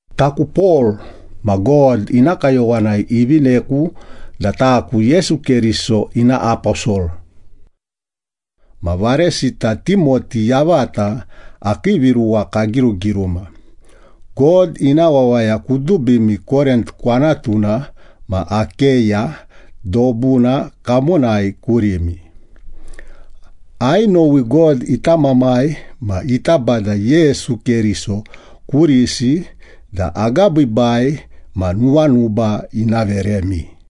Taku Pol ma God ina kayowanai ivineku da taku Yesu Keriso ina aposol. Ma varesita Timoti yavata akii viruwa kagirugiruma, God ina wawaya kudubimi Korint kwanatuna ma Akeya dobuna kamonai kurimi. Ainowi God ita Mamai ma ita Bada Yesu Keriso kurisi da agabiibai ma nuwanuba ina veremi.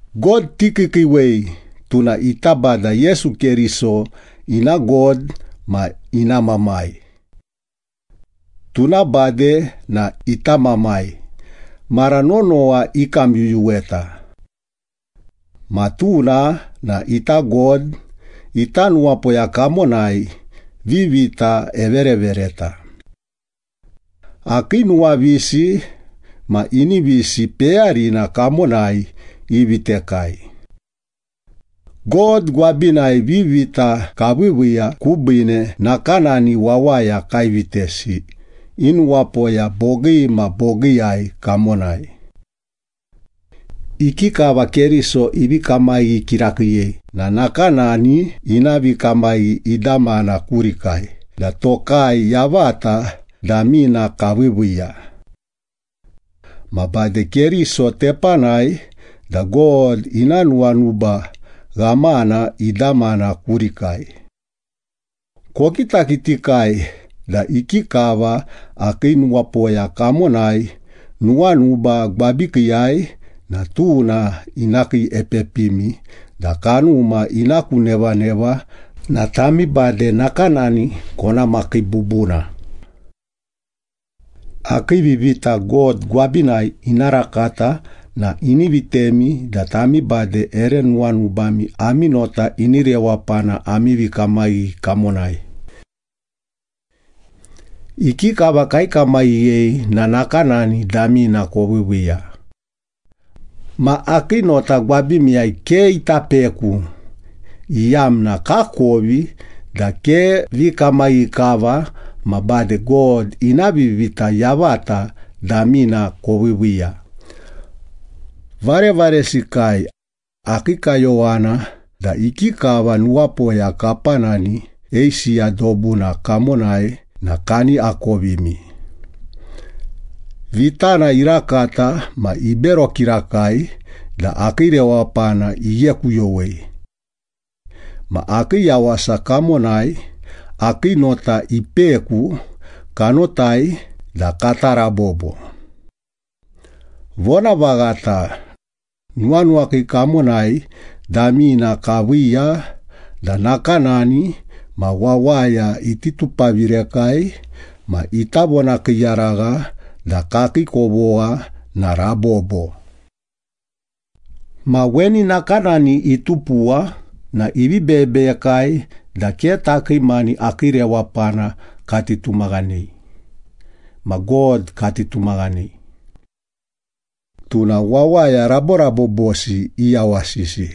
God tikiikiiwei, tuna ita Bada Yesu Keriso ina God ma ina Mamai. Tuna bade na ita Mamai, mara nonowa ikamyuyuweta. Ma tuna na ita God, ita nuwapoya kamonai vivita everevereta. Akii nuwavisi ma inivisi peyarina kamonai ivitekai. God gwabinai vivita kaviiviiya kubiine, nakanani wawaya kaivitesi i nuwapoya bogii ma bogiiyai kamonai. Ikikava Keriso ivi kamaghi kirakiiyei na nakanani ina vikamaghi idamana kurikai da tokai yavata damina kaviiviiya. Ma bade Keriso tepanai da God ina nuwanuba ghamana idamana kurikai. Kokitakitikai da ikikava akii nuwapoya kamonai nuwanuba gwabikiiyai na tuna ina kiiepepimi da kanuma ina ku nevaneva na tami bade nakanani kona makii bubuna. Akii vivita God gwabinai ina rakata na ini vitemi da tami bade ere nuwanubami ami nota ini rewapana ami vikamaghi kamonai. Ikikava kaikamaghiyei na nakanani damina koviiviiya. Ma akii nota gwabimiyai ke ita peku, iyamna kakovi da ke vikamaghi kava ma bade God ina vivita yavata damina koviiviiya. Varevaresikai, akii kayowana da ikikava nuwapoya kapanani Eisiya dobuna kamonai na kani akovimi. Vitana irakata ma ibero kirakai da akii rewapana ighekuyowei. Ma akii yawasa kamonai akii nota ipeku, kanotai da kata rabobo. Vonavaghata, nuwanuwakii kamonai damina kaviiya da nakanani ma wawaya iti tupavirekai ma ita vonakiiyaragha da kakii kovogha na rabobo. Ma weni nakanani itupuwa na ivi beyebeyekai da ke takii mani akii rewapana kati tumaghanei, ma God kati tumaghanei. Tuna wawaya raborabobosi iyawasisi.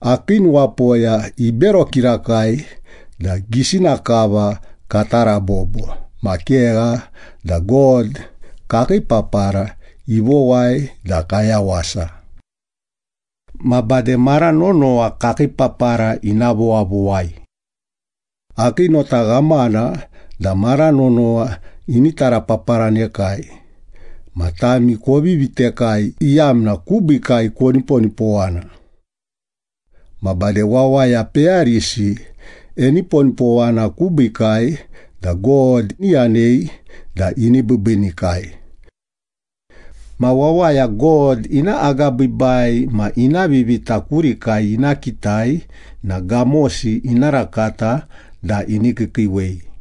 Akii nuwapoya ibero kirakai da gisina kava kata rabobo ma kegha da God kakii papara ivowai da kayawasa. Ma bade mara nonowa kakii papara ina vowavowai. Akii nota ghamana da mara nonowa ini tarapaparanekai, ma tami kovi vitekai iyamna kubiikai koniponipowana. Ma bade wawaya peyarisi eniponipowana kubiikai da God iyanei da ibiibiinikai. Ma wawaya God ina agabiibai ma ina vivita kurikai ina kitai na gamosi ina rakata da ini kiikiiwei.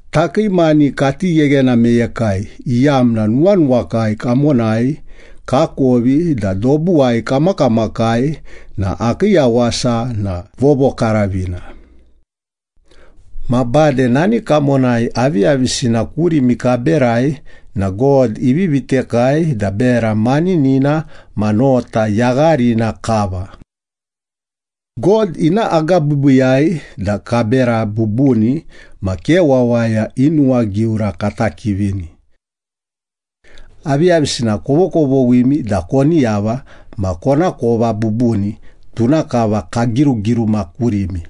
Takii mani kati gheghena meyekai, iyamna nuwanuwakai kamonai kakovi da dobuwai kamakamakai na akii yawasa na vovokaravina. Ma bade nani kamonai aviyavisina kurimi kaberai na God ivi vitekai da bera maninina ma nota yagharina kava. God ina agabiibiiyai da kabera bubuni, ma ke wawaya i nuwagiura kata kivini. Aviyavisina kovokovoghimi da koni yava ma konakova bubuni, tuna kava kagirugiruma kurimi.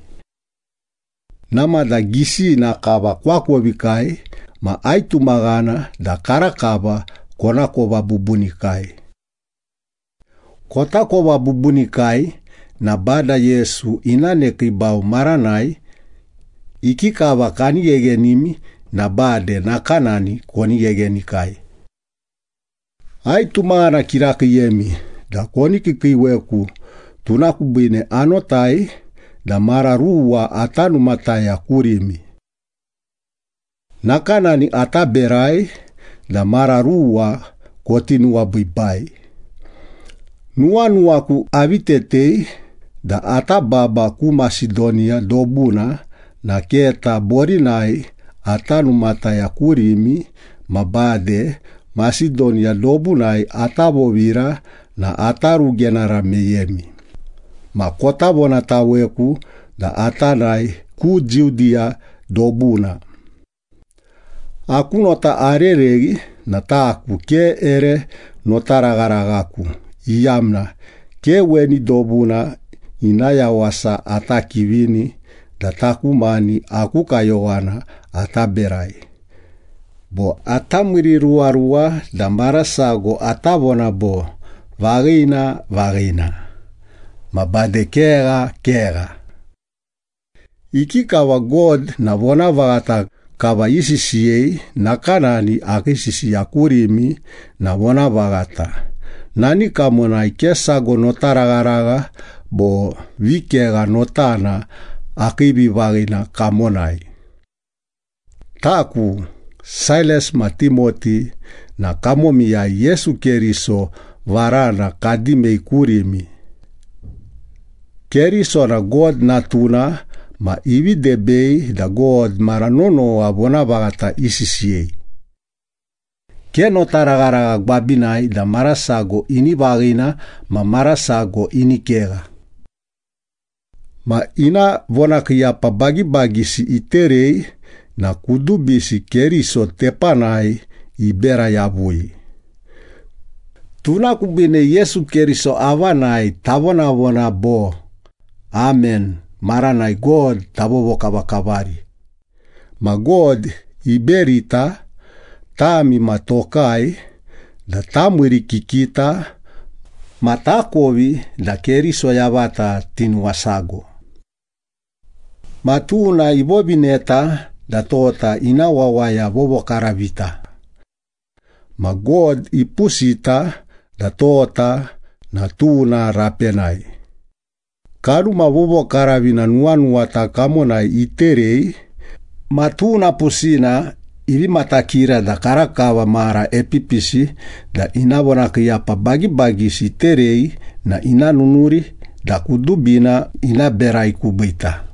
Namada gisina kava koakovikai ma aitumaghana da karakava konakova bubunikai. Kotakova bubunikai na Bada Yesu ina nekiibau maranai, ikikava kani gheghenimi na bade nakanani koni gheghenikai. Aitumaghana kirakiiyemi da koni kiikiiweku, tuna kubiine anotai da mara ruwa ata numataya kurimi. Nakanani ata berai da mara ruwa koti nuwabiibai. Nuwanuwaku avi tetei da ata baba ku Masedoniya dobuna na keta borinai ata numataya kurimi ma bade Masedoniya dobunai ata vovira na ata rugenara meyemi, ma kota vonataweku da ata nae ku Judiya dobuna. Aku nota arereghi na taku ke ere notaragharaghaku, iyamna ke weni dobuna ina yawasa ata kivini da taku mani aku kayowana ata berai bo ata miiriruwaruwa da marasago ata vona bo, “Vaghina, vaghina” ma bade “Kegha, kegha.” Ikikava God na vonavaghata kava isisiyei, nakanani akii sisiya kurimi na vonavaghata, nani kamonai ke sago notaragharagha bo vikegha notana akii vivaghina kamonai. Taku, Sailas ma Timoti na kamomiyai Yesu Keriso varana kadimei kurimi. Keriso na God Natuna ma ivi debei da God mara nonowa vonavaghata isisiyei. Ke notaragharagha gwabinai da mara sago ini vaghina ma mara sago ini kegha. Ma ina vonakiiyapa bagibagisi iterei na kudubisi Keriso tepanai ibera yavui. Tuna kubiine Yesu Keriso avanai tavonavona bo, ‘Amen’ maranai God tavovokavakavari. Ma God iberita, tami ma tokai, da tamiirikikita ma takovi da Keriso yavata tinuwasago. Ma tuna ivovineta da tota ina wawaya vovokaravita. Ma God ipusita da tota na tuna rapenai. Kanuma Vovokaravina nuwanuwata kamonai iterei, ma tuna pusina ivi matakira da karakava mara epipisi da ina vonakiiyapa bagibagisi iterei na ina nunuri da kudubina ina berai kubiita.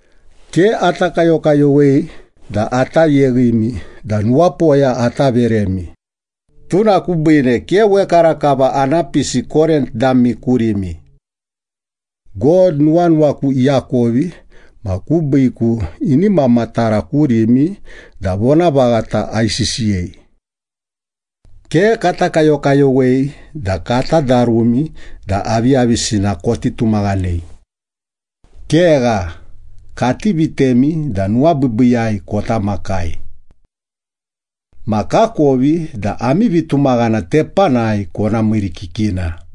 Ke ata kayokayowei da ata yeghimi da nuwapoya ata veremi. Tuna kubiine ke wekarakava ana pisi Korint dami kurimi. God nuwanuwaku iakovi ma kubiiku ini mamatara kurimi da vonavaghata aisisiyei. Ke kata kayokayowei da kata darumi da aviyavisina koti tumaghanei. Kegha, kati vitemi da nuwabiibiiyai kota makai. Ma kakovi da ami vitumaghana tepanai kona miirikikina.